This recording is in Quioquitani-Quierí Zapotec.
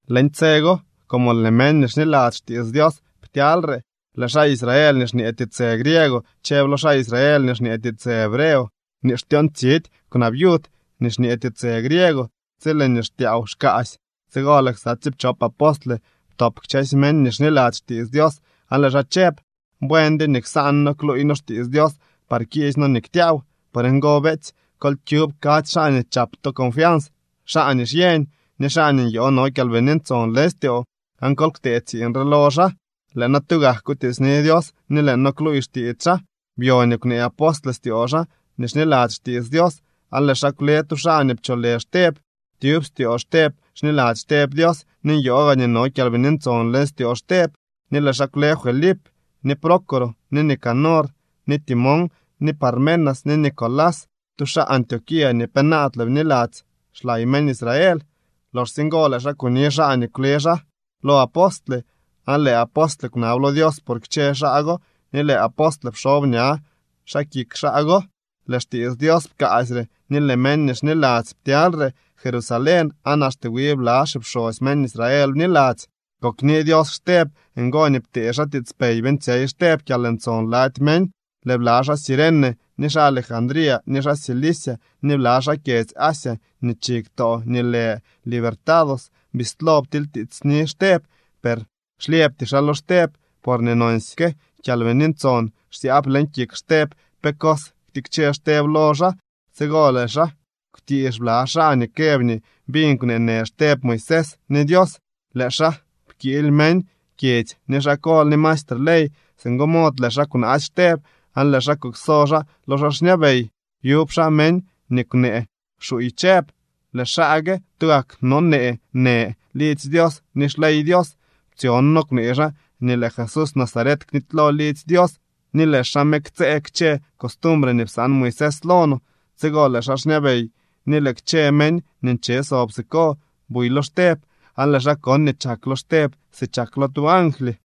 Leñ tse go, como lëë meñ nii xniladzy xtiits Dios ptyalyre, lëë xaa Israel nii xñee tiitsë griego chëb lo xaa Israel nii xñee tiitsë hebreo nii xtyoontsidy kwnaa viud nii xñee tiitsë griego tsi lëë nii xtyaaw xkaasy. Tsigo lëë ksa tsiipchop apostle ptop kchësy meñ nii xniladzy xtiits Dios aan lëë xaa chëb: —Buendyo nii ksaan noo kluuy noo xtiits Dios par kiisy noo nii ktyaaw. Por ngo, beetsy, kol kyub kadzy xaa nii chap to confians, xaa nii xyeñ, ni xaa nii nyoo no Kyalbini Ntson leñ styoo, aan kol ktee tsiiñ re lo xaa. Lëë noo tugak kutiitsni Dios ni lëë noo kluuy xtiits xaa. Byo nii kwnee apostle styoo xaa nii xniladzy xtiits Dios, aan lëë xaa kwle tu xaa nii pcholë Xteb. Tyub styoo Xteb xniladzy Xteb Dios ni nyoo gaa nii no Kyalbini Ntson leñ styoo Xteb. Ni lëë xaa kwle Felip, ni Prócoro, ni Nicanor, ni Timón, ni Parmenas, ni Nicolás, tu xaa Antioquía nii penaadle bniladzy xlay meñ Israel. Loxsye ngo lëë xaa kuni xaa nii kwle xaa lo apostle, aan lëë apostle kwnab lo Dios por kchë xaa go ni lëë apostle pxob ña xaa kik xaa go. Lëë xtiits Dios pkaasyre, ni lëë meñ nii xniladzy ptyalyre Jerusalén, aan axte wi bla xipxosy meñ Israel bniladzy. Kokni Dios Xteb. Ngo nii ptee xaa tiitspey beeñtsyey Xteb kyalntson lady meñ. Lëë bla xaa Cirene, ni xaa Alejandría, ni xaa Cilicia, ni bla xaa kyedzy Asia, nii chi ktoo nii lë Libertados, bislo ptilytiitsni Xteb. Per xlyëbty xaa lo Xteb, porñee nonsyke Kyalbini Ntson xsyaab leñ kik Xteb pe cos ktikche Xteb lo xaa. Tsigo lëë xaa kwtiix bla xaa nii këb nii biñ kwneenë Xteb Moisés ni Dios. Lëë xaa pkiily meñ kyedzy ni xaa kol ni maestre ley. Singo mod lëë xaa kwnaasy Xteb aan lëë xaa kukso xaa lo xaa xñabey. Byubak xaa meñ nii kwnee xuuy chëb: —Lëë xaa gue tugak nonee në lidzy Dios ni xley Dios. Ptsyon noo kwnee xaa nii lëë Jesús Nazaret knitylo lidzy Dios ni lëë xaa me ktsëë kchë costumbre nii psaan Moisés lo no. Tsigo lëë xaa xñabey ni lëë kchë meñ nii nche sob siko buy lo Xteb, aan lëë xaa kon nii chak lo Xteb si chak lo tu angly.